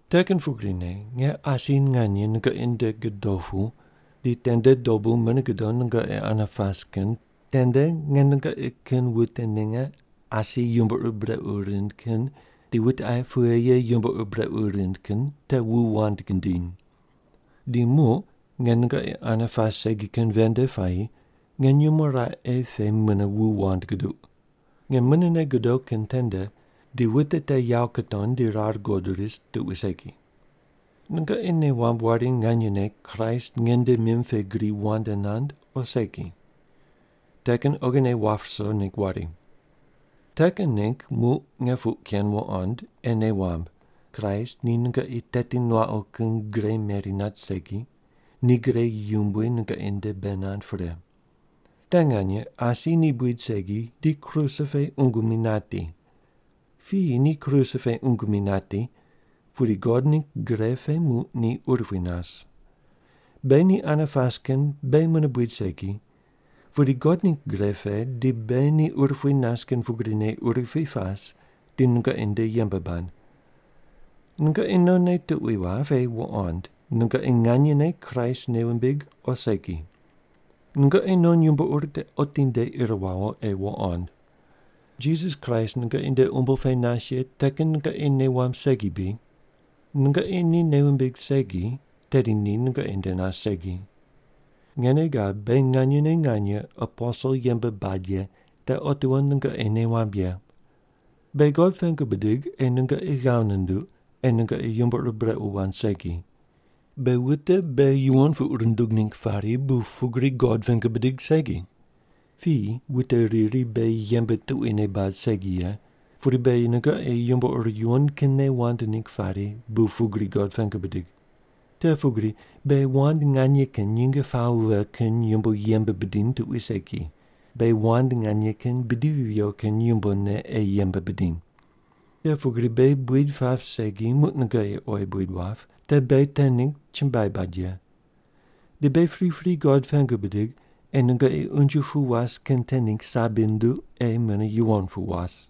Te kin pugrine nge asi nganye nungoqi nde godo pu di tende dobu mune godo nungoqi ane pas kin tende nge nungoqi kin wute ninge asi yumbo ur brequ rind kin di wute aye pughe ye yumbo ur brequ rind kin te wu wand gidiny. Di muq nge nungoqi ane pas segi kin ven nde puayi nge nyumo raqe pe mune wu wand guduq. Nge munene godo kin tende di wute te yawo kutony di rar guqod ris tuqui segi. Nungoqi nei wamb wari nganyene Kraist nge nde mim pe gri wand nand o segi. Te kin oghine wap ruso ningg wari. Te kin ningg muq nge puq ken wuqond ei nei wamb, Kraist ni nungoqi teti nuaqu kin gre meri nat segi, ni gre yumbui nungoqi nde bei nand pre. Te nganye asi ni buid segi di kruse pe qungu mi nati. Piyi ni kruse pe ungu mi nati, pudi God ningg gre pe muq ni urupui nas. Beghi ni ane pas kin beghi mune buid segi, pudi God ningg gre pe di beghi ni urupui nas kin pugrine urupui pas di nungoqi nde yembe bad. Nungoqi nonne tuqui wap ei wuqond nungoqi nganyene Kraist nei wumbig o segi. Nungoqi non yumbo ur te otinde ir wawo ei wuqond. Jisas Kraist nungoqi nde umbo pe nas ye, te kin nungoqi nei wamb segi bri? Nungoqi ni nei wumbig segi, tedi ni nungoqi nde nas segi. Nge nei gab beghi nganyene nganye aposel yembe bad ye te otiwo nungoqi nei wamb ye. Beghi God pengu bidig ei nungoqi ghav nunduq ei nungoqi yumbo ur brequ wand segi. Beghi wute beghi yuwon puq rundug ningg pari bu pugri God pengu bidig segi. Piyi wute riri beghi yembe tuquine bad segi ye, pudi beghi nungoqi yumbo ur yuwon kinne wand ningg pari bu pugri God pengu bidig. Te pugri beghi wand nganye kin nyinge pawo vighe kin yumbo yembe bidiny tuqui segi, beghi wand nganye kin bidivi viyo kin yumbone ei yembe bidiny. Te pugri beghi buid pap segi muq nungoqi oyi buid wap, te beghi te ningg chumbuai bad ye. Di beghi pripri God pengu bidig ei nungoqi unje pu was kin te ningg sabi nunduq ei mune yuwon pu was.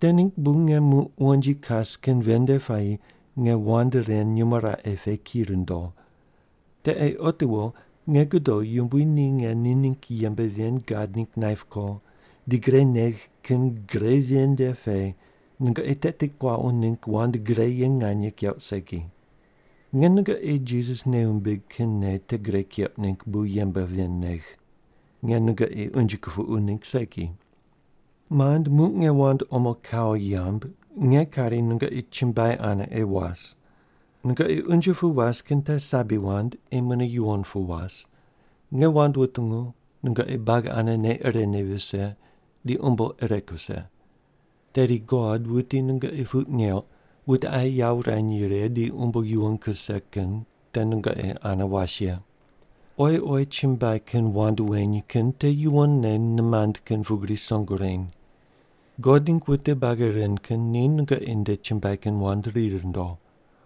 Te ningg bu nge muq wonji kas kin ven nde puayi nge wand ren nyumo raqe pe ki rundo. Te ei otiwo nge godo Yumbui ni nge ni ningg yembe ven gad ningg naip ko di gre negh kin gre ven nde pe nungoqi teti kuaqu ningg wand gre ye nganye keuq segi. Nge nungoqi Jisas nei wumbig kin nei te gre keuq ningg bu yembe ven negh. Nge nungoqi unje kupuqu ningg segi. Mand, muq nge wand omo kawo yamb nge kari nungoqi chumbuai ane ei was. Nungoqi unje pu was kin te sabi wand ei mune yuwon pu was, nge wand wutungu, nungoqi buagi ane nei irene vise, di umbo ire kuse. Tedi God wuti nungoqi puq neuq wute aye yawo wurany righe di umbo yuwon kuse kin te nungoqi ane was ye. Oyi oyi chumbuai kin wand weny kin te yuwonne nimand kin pugri song wureny. God ningg wute buagi ren kin ni nungoqi nde chumbuai kin wand ri rundo.